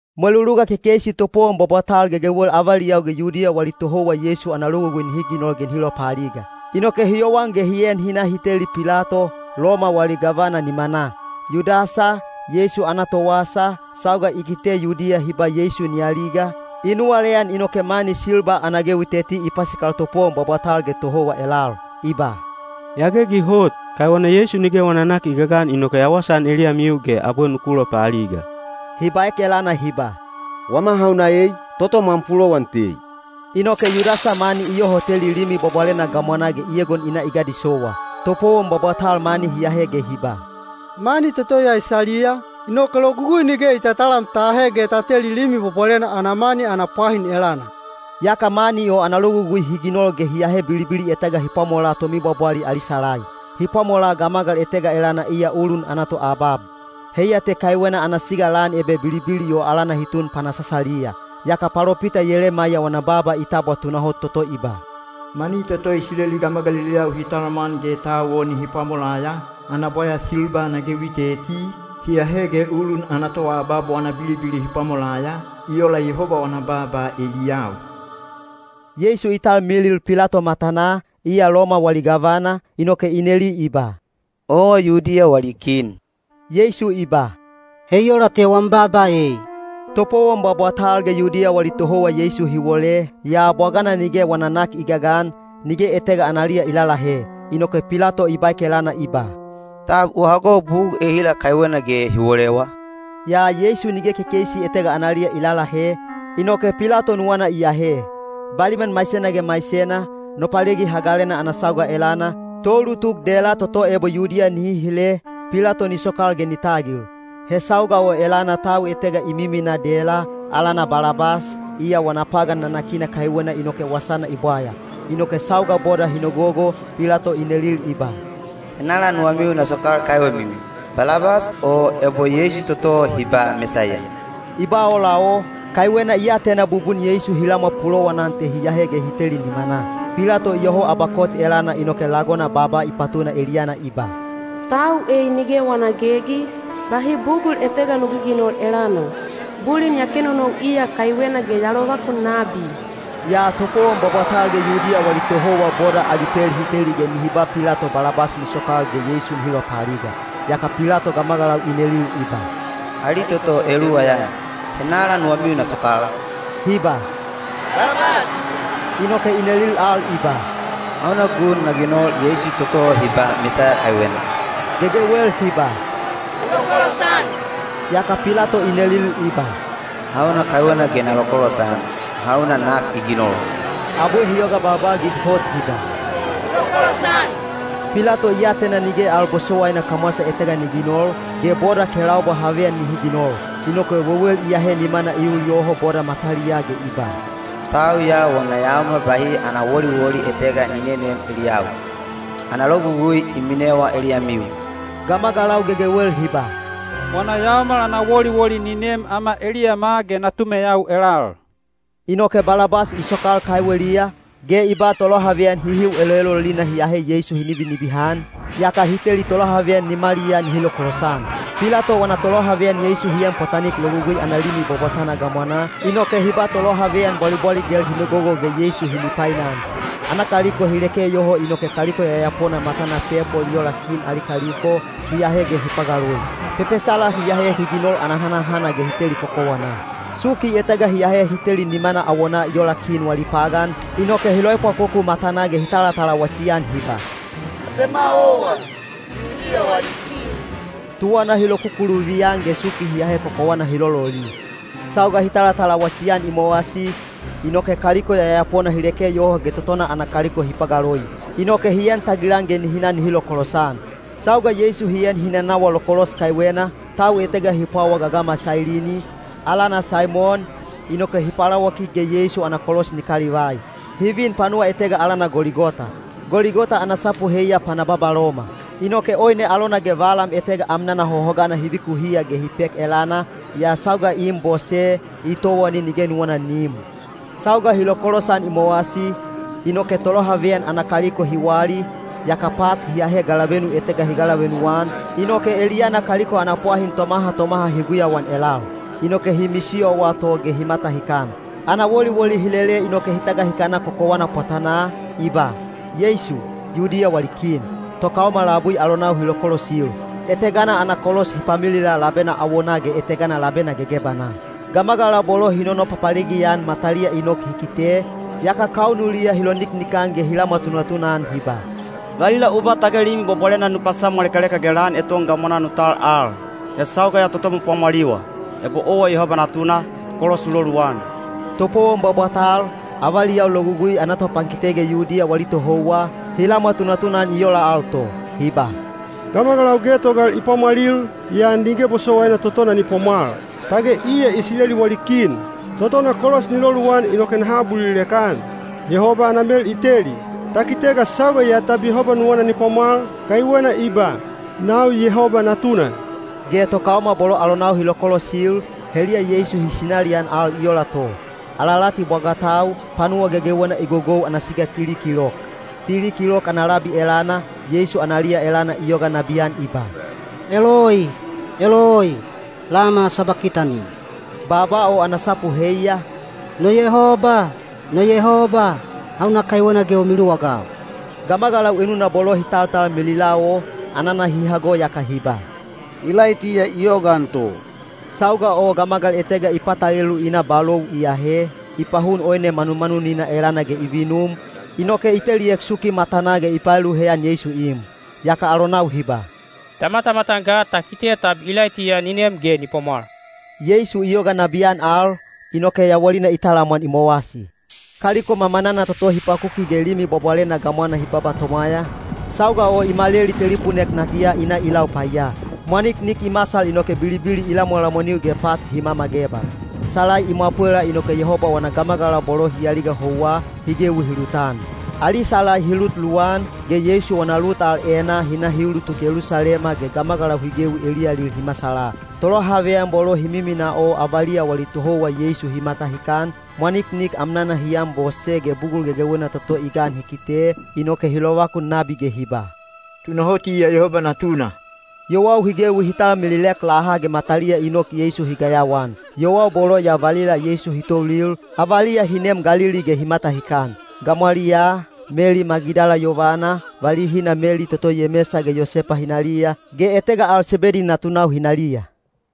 Mweluluga kekeisi topowon bwabwatal gegewel avaliyau ge Yudiya wali tohouwa Yeisu ana logugui hi ginol ge nihi lopaaliga. Inoke hi yowan ge hi en hi na hi teli Pilato, Loma wali gavana nimanaa. Yudasa, Yeisu ana towasa, sauga i kite Yudiya hi ba Yeisu ni aliga, i nuwaleyan inoke mani silba ana gewi teti i pasikal topowon bwabwatal ge tohouwa elal. I ba, “Ya gegi hot, kaiwena Yeisu nige wana nak i gagan inoke ya wasaan eliyamiu ge abwe nuku lopaaliga.” Hi baek elana hi ba, “Wama hauna ei! Totom am pulowan tei.” Inoke Yudasa mani i yoho teli Limi Bwabwalena gamwanaa ge i egon i na i gadisowa. Topowon bwabwatal mani hi ahe ge hi ba, “Mani toto ya i saliya, inoke Logugui nige i tatalam ta ahe ge ta teli Limi Bwabwalena ana mani ana pwahin elana.” Yaka mani o ana logugui hi ginol ge hi ahe bilibili etega hi pwamolaa tomibwabwali ali salai. Hi pwamolaa gamagal etega elana iya ulun ana toabab. Heiya te kaiwena ana siga lan ebe bilibili o alana hi tun Panasasaliya. Yaka palopita Yelemaiya wana baaba i tabwa tunahot toto i ba, “Mani toto Isileli gamagaliliyau hi talamwan ge tau o nihi pwamolaya, ana bwaya silba ana gewi teti, hi ahe ge ulun ana toabab wana bilibili hi pwamolaya, i ola Yehoba wana baaba eliyau.” Yeisu i talmilil Pilato matanaa, iya Loma wali gavana, inoke i neli i ba, “Owa Yudiya wali kin?” Yeisu i ba, “He i ola te wam baaba ei.” Topowon bwabwatal ge Yudiya wali tohouwa Yeisu hi wole, yaa bwagana nige wana nak i gagan, nige etega analiya i lalahe. Inoke Pilato i baek elana i ba, “Tab u hago bugul ehila kaiwena ge hi wolewa?” Yaa Yeisu nige kekeisi etega analiya i lalahe, inoke Pilato nuwana i ahe. Baliman maisena ge maisena, Nopalegi Hagalena ana sauga elana, toulutuk dela toto ebo Yudiya nihi hile, Pilato ni sokal ge ni tagil. He sauga o elana tau etega i miminaa dela, alana Balabas, iya wana pagan nanakina kaiwena inoke wasana i bwaya. Inoke sauga boda hi nogogo, Pilato i nelil i ba, “Henala nuwamiu na sokal kaiwemiu, Balabas o ebo Yeisu toto hi ba Mesaiya?” I ba ola o, kaiwena i atena bubun Yeisu hi lamwa pulowanan te hi ahe ge hi teli nimanaa. Pilato iyoho abakot elana inoke lagona baaba i patuna eliyana i ba, “Tau ei nige wana gegi, bahi bugul etega nu giginol elana. Bulin ya kenonou iya kaiwena ge ya lovakun nabi.” Yaa topowon bwabwatal ge Yudiya wali tohouwa boda ali pel hi teli ge nihi ba Pilato Balabas ni sokal ge Yeisu nihi lopaaliga. Yaka Pilato gamagalau i nelil i ba, “Ali toto eluwa ya, henala nuwamiu na sokal?” Hi ba, “Balabas.” Inoke i nelil al i ba, “Hauna gun na ginol Yeisu toto hi ba Mesaiya kaiwena?” Gegewel hi ba, “U lokolosan!” Yaka Pilato i nelil i ba, “Hauna kaiwena ge na lokolosan? Hauna nak i ginol?” Abwe hi yoga balbalgig hot hi ba, “U lokolosan!” Pilato i atena nige al bosowaina kamwasa etega ni ginol, ge boda kelaubwa haveyan nihi ginol. Inoke wewel i ahe nimana i ul yoho boda mataliyaa ge i ba, “Tau ya wana yaomal bahi ana woliwoli etega ni nenem eliyau. Ana logugui i minewa eliyamiu.” Gamagalau gegewel hi ba, “Wana yaomal ana woliwoli ni nem ama eliyama ge natumeyau elal.” Inoke Balabas i sokal kaiweliya, ge i ba tolohaveyan hihiu eloelolina hi ahe Yeisu hi nibinibihan, yaka i teli tolohaveyan nimaliyaa nihi lokolosan. Pilato wana tolohaveyan Yeisu hi en pwatanik logugui ana limi bwabwatana gamwanaa, inoke hi ba tolohaveyan bwalibwaligel hi nogogo ge Yeisu hi mipainan. Ana kaliko hi leke yoho inoke kaliko yayapona matana pepol i ola kin ali kaliko, hi ahe ge hi pagaloi. Pepesala hi ahe hi ginol ana hanahana ge hi teli kokowanaa. Suki etega hi ahe hi teli nimana awonaa i ola kin wali pagan, inoke hi loepwakoku matanaa ge hi talatalawasi-an hi ba, “Atema owa, Yudiya wali kin!” Tuwana hi lokukuluvi-an ge suki hi ahe kokowana hi lololi. Sauga hi talatalawasi-an i mowasi, inoke kaliko yayapona hi leke yoho ge totona ana kaliko hi pagaloi. Inoke hi en tagilan ge nihi na nihi lokolosan. Sauga Yeisu hi en hi nanawa lokolos kaiwena, tau etega hi pwawa gagama Sailini, alana Saimon, inoke hi palawakik ge Yeisu ana kolos ni kalivai. Hi vin panuwa etega alana Goligota. (Goligota ana sapu heiya “Pana Babaloma.”) Inoke oine alona ge valam etega amnana hohogana hi vikuhiya ge hi pek elana, yaa sauga i im bose, i towani nige nuwana ni im. Sauga hi lokolosan i mowasi, inoke tolohaveyan ana kaliko hi wali, yaka pat hi ahe galavenu etega hi galavenu-an, inoke eliyana kaliko ana pwahin tomaha tomaha hi guyauan elal. Inoke hi misiyowa to ge hi matahikan. Ana woliwoli hi lele inoke hi tagahikana kokowana pwatanaa, i ba, “Yeisu, Yudiya wali Kin.” Tokaoma labui alonau hi lokolosil. Etegana ana kolos hi pamilila labena awonaa ge etegana labena gegebanaa. Gamagalau bolo hi nonopapalegi-an mataliya i nok hi kite, yaka kaunuliya hi loniknikan ge hi lamwa tunatuna-an hi ba, “Valila u ba tage Limi Bwabwalena nu pasamwalekaleka ge lan eton gamwanaa nu tal al. He sauga ya totom u pwamwaliwa. Ebo owa Yehoba natuna, kolos u loluwan.” Topowon bwabwatal, avaliyau Logugui ana topankite ge Yudiya wali tohouwa, hi lamwa tunatuna-an i ola al to. Hi ba, “Gamagalau getogal i pwamwalil, yaa nige bosowaina totona ni pwamwal. Tage iya Isileli wali kin! Totona kolos ni loluwan inoke naha abulilek-an. Yehoba ana mel i teli. Ta kite ga sauga ya tab Yehoba nuwana ni pwamwal, kaiwena i ba, ‘Nau Yehoba Natuna.’” Ge tokaoma bolo alonau hi lokolosil, heliya Yeisu hi sinalian al i ola to. Alalati bwagatau, panuwa gegewena i gogou ana siga tili kilok. Tili kilok ana labi elana, Yeisu analiya elana i yoga nabiyan i ba, “Eloi, eloi, lama sabakitani?” Baaba o ana sapu heiya, “No Yabowaine, no Yabowaine, hauna kaiwena ge u miluwagau?” Gamagalau enuna bolo hi taltalmilila o, anana hi hago yaka hi ba, “Ilaitiya i yogaan to.” Sauga o gamagal etega i patalelu i na balou i ahe, i pahun oine manumanunina elana ge i vinum, inoke i teliek suki matanaa ge i paelu heyan Yeisu i im. Yaka alonau hi ba, “Ta matamatan ga ta kite tab Ilaitiya ni nem ge ni pwamwal.” Yeisu i yoga nabiyan al, inoke yawalina i talamwan i mowasi. Kaliko mamanana toto hi pakuki ge Limi Bwabwalena gamwana hi baba tomwaya, sauga o i maleli telipunek natiya i na i lau paiya. Mwaniknik i masal inoke bilibili i lamwalamwaniu ge pat hi mamagebal. Salai i mwapwela inoke Yehoba wana gamagalau bolo hi aliga houwa, hi gewi hi lutan. Ali salai hi lut luwan, ge Yeisu wana lut al enaa hi na hi ulutuk Yelusalema ge gamagalau hi gewi eliyalil hi masala. Tolohaveyan bolo hi miminaa o avaliya wali tohouwa Yeisu hi matahikan, mwaniknik amnana hi anbose ge bugul gegewena toto i gan hi kite, inoke hi lovakun nabi ge hi ba, “Tunahot iya Yehoba Natuna!” Yowau hi gewi hi talmililek laha ge mataliya i nok Yeisu hi gayawaan. Yowau bolo ya valila Yeisu hi toulil, avaliya hi neem Galili ge hi matahikan. Gamwaliyaa, Meli Magidala yovana, valihina Meli toto Yemesa ge Yosepa hinaliya, ge etega al Sebedi natunau hinaliya.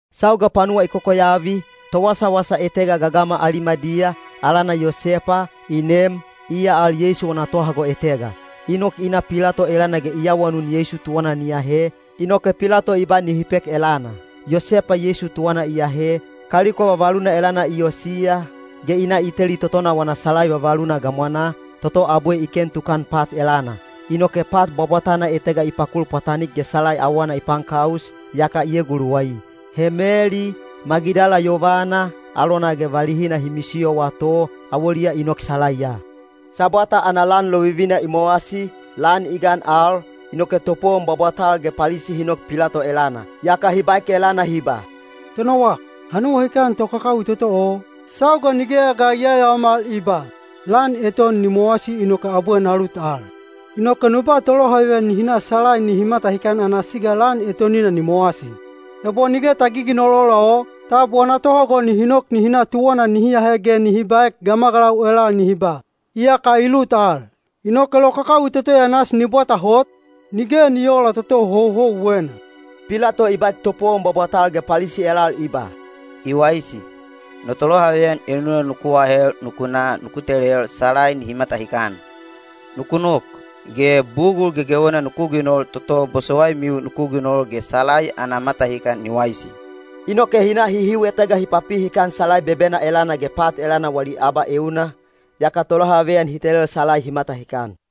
Sauga panuwa i kokoyavi, towasawasa etega gagama Alimadiya, alana Yosepa, i nem, iya al Yeisu wana tohago etega. I nok i na Pilato elana ge i awanun Yeisu tuwana ni ahe, inoke Pilato i ba nihi pek elana. Yosepa Yeisu tuwana i ahe, kaliko vavaluna elana i osiya, ge i na i teli totona wana salai vavaluna gamwanaa, toto abwe i ken tukan pat elana. Inoke pat bwabwatana etega i pakul pwatanik ge salai awana i paankaus, yaka i eguluwai. He Meli, Magidala yovana, alona ge valihina hi misiyowa to, awoliya i nok salaiya. Sabwata ana lan lovivina i mowasi, lan i gan al, inoke topowon bwabwatal ge Palisi hi nok Pilato elana. Yaka hi baek elana hi ba, “Tonowak, ha nuwahikan tokakawi toto o, sauga nigeya ga i yayaomal i ba, ‘Lan eton ni mowasi inoke abwe na lut al.’ Inoke nu ba tolohaveyan nihi na salai nihi matahikan ana siga lan etonina ni mowasi. Ebo nige ta giginol ola o, tab wana tohago nihi nok nihi na tuwana nihi ahe ge nihi baek gamagalau elal nihi ba, ‘Iyaka i lut al.’ Inoke lokakawi toto ya nasi ni bwata hot, nige ni oola toto houhouwena.” Pilato i baek topowon bwabwatal ge Palisi elal i ba, “I waisi, no tolohaveyan enuna nuku ahel nuku na nuku telel salai nihi matahikan. Nuku nok, ge bugul gegewena nuku ginol toto bosowaimiu nuku ginol ge salai ana matahikan ni waisi.” Inoke hi na hihiu etega hi papi hikan salai bebena elana ge pat elana wali abaeuna, yaka tolohaveyan hi telel salai hi matahikan.